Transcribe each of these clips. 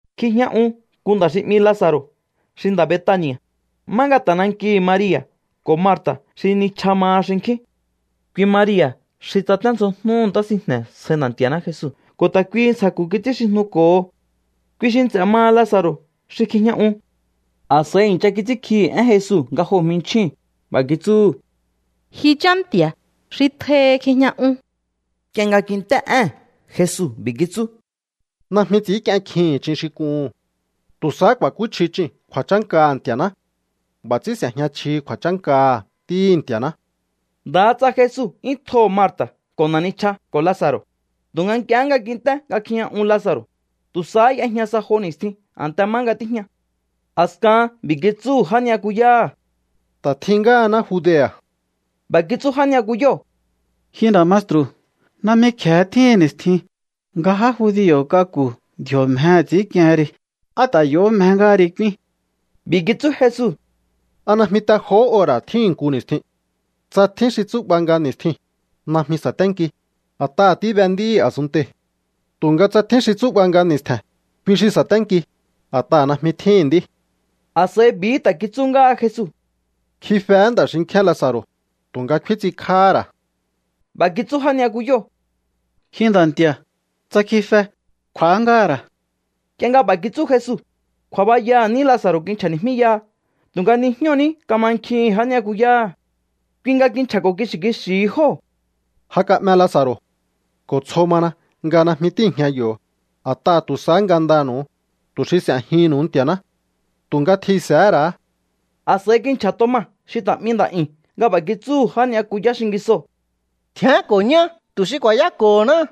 Kjijña un nku nda̱ xi 'mi Laza̱ro̱ xi nda̱ Betani̱a̱, má nga ta̱ nankihi̱ Maria̱ ko̱ Marta̱ xi nichja maha xinkjín. Kui Maria̱ xi tsaténdzjojnúhu̱ ntá sinjne̱ sjai Nda̱ Nti̱a̱ná Jesu ko̱ ta̱ kuihi ntsja̱ku̱ kits'ínxijnuko̱ho. Kui xi nts'e̱ maha Laza̱ro̱ xi kjijña uu̱n. A̱s'a̱i i̱ncha kits'ínkjihi̱ én Jesu nga joo̱ jminchjíu̱n. B'a̱ kitsúhu̱: —Ji Chá Nti̱a̱, xi tjohi kjijña un. Nk'ie nga kint'é ée̱n Jesu, b'i̱ kitsú: —Najmi ts'i̱ínk'ien kjihi̱n ch'in xi k'uhu̱n. Tu̱ sahá ku̱a̱kúchji ch'iu̱n kju̱a̱chánkaha̱ Nti̱a̱ná. B'a̱ ts'ín s'e̱jña chjihi kju̱a̱chánkaha̱ Ntíhi̱ Nti̱a̱ná. Ndaha tsa Jesu 'yún tjoho̱ Marta̱ ko̱ na̱ nichja ko̱ Laza̱ro̱, tu̱nga nk'ie nga kint'é nga kjijña un Laza̱ro̱, tu̱ sahá y'ejña sa jo ni̱stjin a̱nte má nga tíjña. A̱skahan b'i̱ kitsúhu̱ já ni'yakuyáha̱: —Ta̱ tjihín ngáhaná Judea̱. B'a̱ kitsú já ni'yakuyóo̱: —Ji nda̱ maestru̱, najmi kje̱e tjíhi̱n ni̱stjin nga já judio̱ k'aku̱ ndji̱o̱ mjehe̱ ts'i̱ínk'iehen ri. ¿Á ta̱ yo̱hó mje ngáha ri k'úín? B'i̱ kitsú Jesu: —¿A najmi te johó ora̱ tjíhi̱n nku ni̱stjin? Tsa tjín xi tsú'ba nga ni̱stjiu̱n, najmi sa̱ténki, a̱t'aha̱ tíbe nd'íhi̱ a̱sunntei̱. Tu̱nga tsa tjín xi tsú'ba nga ni̱stje̱n, kui xi sa̱ténki, a̱t'aha̱ najmi tjíhi̱n nd'í. A̱s'a̱i b'i̱hí ta̱ kitsú ngáha Jesu: —Kjifehé nda̱ xinki̱á Laza̱ro̱, tu̱nga kfín ts'inkj'áhá ra̱. B'a̱ kitsú já ni'yakuyóo̱: —Ji Nda̱ Nti̱a̱, tsa kjife, kj'u̱á ngáha̱ ra̱. Nk'ie nga b'a̱ kitsú Jesu, kju̱a̱bayaha̱ ní Laza̱ro̱ kinchja̱ni̱jmíyaha tu̱nga nijñóo̱ ní kamankjihi̱n já ni'yakuyáha̱. Kui nga kinchja̱ko̱ kixi̱ kixi̱hi jóo̱: —Ja ka'me Laza̱ro̱. Ko̱ tsjo mana nga najmi tíi̱jña yo̱, a̱t'aha̱ tu̱ sahá ngandanu̱u, tu̱ xi s'e̱jihi̱nnu̱u Nti̱a̱ná. Tu̱nga tjihi̱nse̱hé ra̱á. A̱s'a̱i kinchja̱ Toma xi ta̱ 'mi Nda̱'yu̱n nga b'a̱ kitsúhu̱ já ni'yakuyá xingisoo̱: —Tjián ko̱ ñá tu̱ xi ku̱a̱yáko̱honá.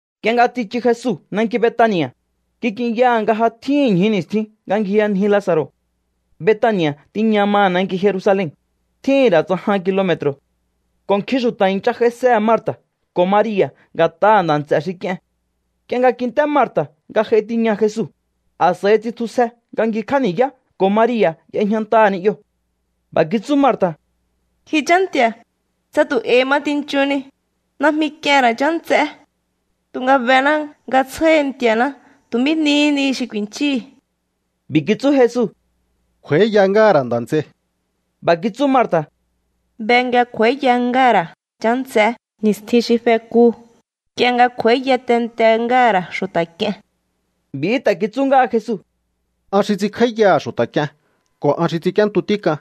Nk'ie nga tsichu Jesu nanki Betani̱a̱, kik'inyaha̱ nga ja tjíhi̱n ñju ni̱stjin nga ngjiyanji Laza̱ro̱. Betani̱a̱ tiña maha̱ nanki Jerusalen, tjíhi̱n ra̱ tsa jan kilome̱tro̱. Ko̱ nkjin xu̱ta̱ i̱ncha j'aisehe̱ Marta̱ ko̱ Maria̱ nga̱t'aha̱ nda̱ nts'e̱ xi k'ie̱n. Nk'ie nga kint'é Marta̱ nga j'ai tiña Jesu, a̱s'a̱i tsitjusje nga ngjikj'á ni̱yá ko̱ Maria̱ y'ejñantaha̱ ni'yoo̱. B'a̱ kitsú Marta̱: —Ji Chá Nti̱a̱, tsa tu̱ e̱i̱hi ma tinchuhunni, najmi k'ien ra̱ chá nts'é. Tu̱nga bená nga tsjáhi Nti̱a̱ná tu̱ mí nihí ni xi ku̱i̱nchíhi̱. B'i̱ kitsú Jesu: —Kj'u̱a̱íya ngáha̱ ra̱ nda̱ nts'ei. B'a̱ kitsú Marta̱: —Be nga kj'u̱a̱íya ngáha̱ ra̱ chá nts'é ni̱stjin xi fekuu̱, nk'ie nga kj'u̱a̱íya tente ngáha̱ ra̱ xu̱ta̱ k'ie̱n. B'i̱hí ta̱ kitsú ngáha Jesu: —An xi ts'inkj'áíyaha̱ xu̱ta̱ k'ie̱n ko̱ an xi ts'ink'íéntu tík'an.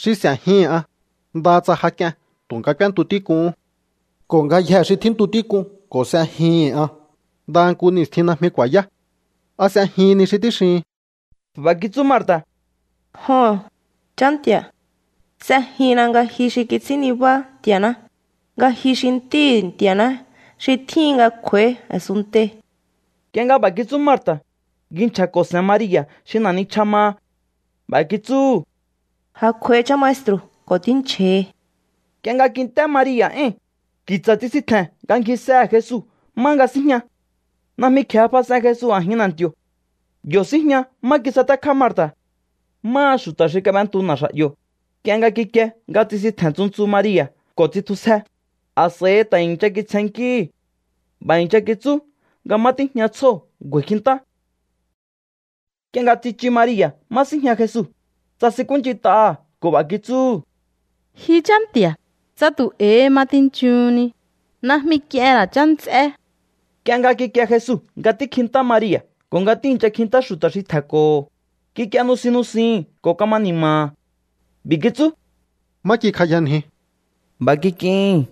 Xi s'e̱jihi̱n an, ndaha tsa ja k'ien tu̱nga k'úéntu tík'uhún. Ko̱ ngayjee̱ xi tjíntu tík'un ko̱ s'ejihi̱n an, ndaha nku ni̱stjin najmi ku̱a̱yá. ¿A s'ejihin ni xi tíxihin? B'a̱ kitsú Marta̱: —Joho̱n, Chá Nti̱a̱. S'ejinna nga ji xi kits'ín nibá Nti̱a̱ná, nga ji xi Ntíhi̱ Nti̱a̱ná xi tjíhin nga kj'u̱a̱í a̱sunntei̱. Nk'ie nga b'a̱ kitsú Marta̱, ngji nchja̱ko̱ se̱n Maria̱ xi na̱ nichja maha. B'a̱ kitsúhu̱: —Ja kj'uai Chá Maestru̱ ko̱ tínchja̱hi. Nk'ie nga kint'é Maria̱ éi̱n, ki̱tsa̱ tsisintje̱n nga ngjisehe̱ Jesu má nga síjña. Najmi kje̱e fas'en Jesu a̱jin na̱nti̱o̱. Yo̱ síjña má kisatékjá Marta̱. Máha xu̱ta̱ xi kab'entu na̱xa̱'yo̱, nk'ie nga kikie nga tsisintje̱n ntsu ntsu Maria̱ ko̱ tsitjusje, a̱s'a̱i ta̱ i̱ncha kitsjennkíhi̱. B'a̱ i̱ncha kitsú nga má tíjña tsjóo̱ ngju̱a̱i̱ kjintá. Nk'ie nga tsichu Maria̱ má síjña Jesu, tsasinkúnch'int'aha̱ ko̱ b'a̱ kitsúhu̱: —Ji Chá Nti̱a̱, tsa tu̱ e̱i̱hi ma tinchuhunni, najmi k'ien ra̱ chá nts'é. Nk'ie nga kikie Jesu nga tíkjintá Maria̱ ko̱ nga tíi̱ncha kjintá xu̱ta̱ xi tje̱nko̱ho̱, kik'ie nusin nusihi̱n ko̱ kama ni̱ma̱ha̱. B'i̱ kitsú: —¿Má kikjayanjiu? B'a̱ i̱ncha kitsú jóo̱: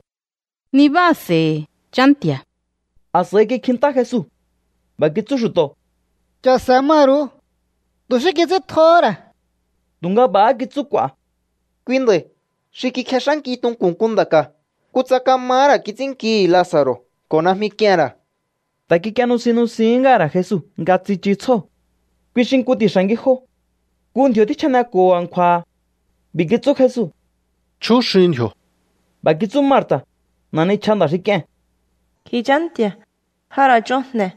—Nibáa̱se̱i̱hi̱, Nda̱ Nti̱a̱. A̱s'a̱i kikjintá Jesu. B'a̱ kitsú xu̱to̱: —Cha̱se̱ maru̱u. Tu̱ xí kits'íntjohó ra̱. Tu̱nga b'a̱há kitsú k'u̱a̱: —Kui nda̱i̱ xi kikjex'ánki tunku̱n nku nda̱ ka̱. Kutsa kamahá ra̱ kits'ínnkihi̱ Laza̱ro̱ ko̱ najmi k'ien ra̱. Ta̱ kik'ie nusin nusihín ngáha̱ ra̱ Jesu nga tsichu tsjóo̱. Kui xi nku ti̱xa̱ ngijo. Nku ndji̱o̱ tjíchjaneko̱ho a̱nkju̱a̱ha̱. B'i̱ kitsú Jesu: —Chjúxiun ndji̱o̱. B'a̱ kitsú Marta̱, na̱ nichja nda̱ xi k'ie̱n: —Ji Chá Nti̱a̱, ja ra̱ ch'on jne̱,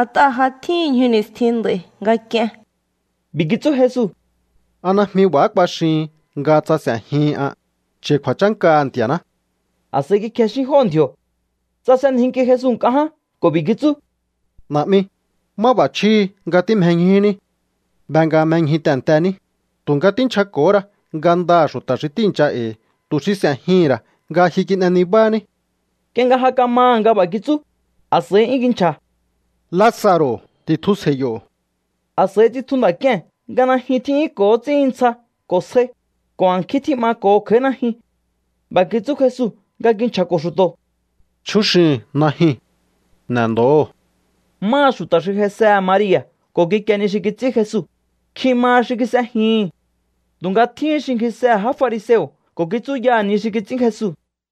a̱t'aha̱ ja tjíhi̱n ñju ni̱stjin nd'a̱i̱ nga k'ien. B'i̱ kitsú Jesu: —¿A najmi b'a̱há kuaxihin nga tsa s'e̱jihin an, cha̱i̱ kju̱a̱chánkaha̱ Nti̱a̱ná? A̱s'a̱i kikjexín jóo̱ ndji̱o̱. Tsasenjinki Jesu nk'a ján ko̱ b'i̱ kitsú: —Na̱'mi, máb'a̱chjíhi nga tímjeñjuní. Be nga mjeñju tehe̱ntení, tu̱nga tínchjako̱hó ra ngandaha̱ xu̱ta̱ xi tíi̱ncha e̱i̱ tu̱ xi s'e̱jihi̱n ra̱ nga ji kin'e nibání. Nk'ie nga ja kamaha̱ nga b'a̱ kitsú, a̱s'a̱i 'yún kinchja̱: —¡Laza̱ro̱, ti̱tjusje̱i̱ yo̱! A̱s'a̱i tsitju nda̱ k'ie̱n nga najyun tjí'yúnko̱ ts'íhin ntsja ko̱ sjai, ko̱ a̱nkjín tjí'mako̱ho kj'a̱í najyun. B'a̱ kitsú Jesu nga kinchja̱ko̱ xu̱to̱: —Chjúxihi̱un najyuu̱n. N'e̱ndo̱hóo̱. Máha xu̱ta̱ xi j'aisehe̱ Maria̱ ko̱ kikie ni xi kits'ín Jesu, nkjin maha xi kis'ejihi̱n. Tu̱nga tjíhín xi ngjisehe̱ já fariseo̱ ko̱ kitsúyaha̱ ni xi kits'ín Jesu.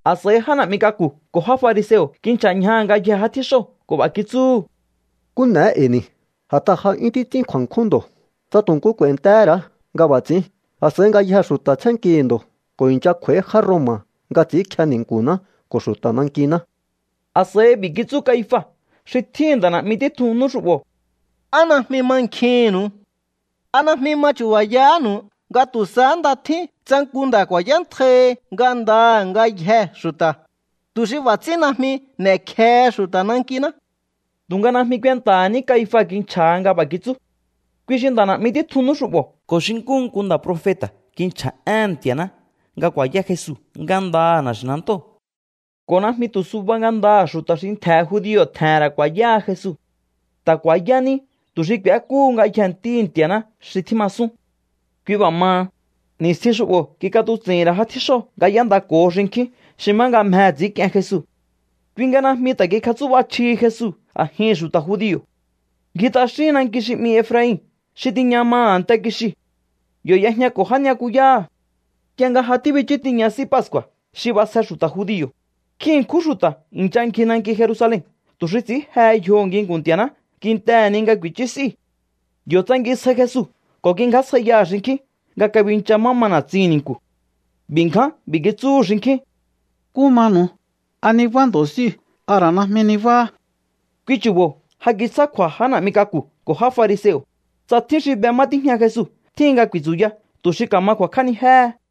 A̱s'a̱i já na̱'mi k'aku̱ ko̱ já fariseo̱ kinchja̱ ñjaha̱ ngayjee̱ já tjíxóo̱ ko̱ b'a̱ kitsúhu̱: —¿Nkú n'e̱é e̱i̱ ni̱? A̱t'aha̱ ja 'yún títs'ín kju̱a̱nkjún ndo̱. Tsa tu̱ nku k'u̱a̱i̱ntehé ra̱á nga b'a̱ ts'i̱ín, a̱s'a̱i ngayjee̱ xu̱ta̱ tsjénnkihi̱ ndo̱ ko̱ i̱ncha kj'u̱a̱í já Roma̱ nga ts'i̱ínkje ni̱nku̱ná ko̱ xu̱ta̱ nankiná. A̱s'a̱i b'i̱ kitsú Caifa xi tjíhi̱n nda̱ na̱'mi títjun nú xu'bo̱: —¿Á najmi mankjihi̱nnu̱u? ¿A najmi ma chu̱ba̱yahánu̱u nga tu̱ sahá nda tjín tsa nku nda̱ ku̱a̱yántjaihi ngandaha̱ ngayjee̱ xu̱ta̱, tu̱ xi b'a̱ ts'ín najmi n'e̱kjehe xu̱ta̱ nankiná? Tu̱nga najmi kuenta̱ha̱ ní Caifa kinchja̱ha nga b'a̱ kitsú. Kui xi nda̱ na̱'mi títjun nú xu'bo̱ ko̱ xi nkúhu nku nda̱ profeta̱ kinchja̱ éhe̱n Nti̱a̱ná nga ku̱a̱yá Jesu ngandaha̱ na̱xi̱nantóo̱. Ko̱ najmi tu̱ suba ngandaha̱ xu̱ta̱ xi ntje̱ judio̱ tje̱he̱n ra̱ ku̱a̱yáha Jesu. Ta̱ ku̱a̱yá ní tu̱ xi k'u̱ékúhu ngayjee̱ ntíhi̱ Nti̱a̱ná xi tjímasún. Kui b'a̱ maha, ni̱stjin xu'bo̱ kik'atuts'i̱hi̱n ra̱ já tjíxóo̱ nga y'éndako̱ho xinkjín xi má nga mjehe̱ ts'i̱ínk'ien Jesu. Kui nga najmi ta̱ kikjatsú'ba chjihi Jesu a̱jihi̱n xu̱ta̱ judio̱. Ngji t'axín nanki xi 'mi Efrain xi tiña maha̱ a̱nte kixiu̱. Yo̱ y'ejñako̱ já ni'yakuyáha̱. Nk'ie nga ja tíbichú tiña S'í Pascu̱a̱ xi b'asje xu̱ta̱ judio̱, nkjin ṉkjún xu̱ta̱ i̱ncha ngji nanki Jerusalen tu̱ xi ts'i̱ín jehe yjoho̱ nginku̱n Nti̱a̱ná kintehe̱ ni nga ku̱i̱chú s'íu̱. Yo̱ tsangisjai Jesu ko̱ kingjásjaiyaha̱ xinkjín nga kabincha má ma na̱tsihi̱n ni̱nku̱. B'i̱ ngján b'i̱ kitsúhu̱ xinkjín: —¿Nkú manu̱u? ¿A nibá ndo̱ s'íu̱? ¿A ra̱ najmi nibáhá? Kui chu̱bo̱ ja kitsjá kju̱a̱ já na̱'mi k'aku̱ ko̱ já fariseo̱, tsa tjín xi be má tíjña Jesu tjíhin nga ku̱i̱tsu̱ya tu̱ xi ka̱ma ku̱a̱kj'ánijéhe.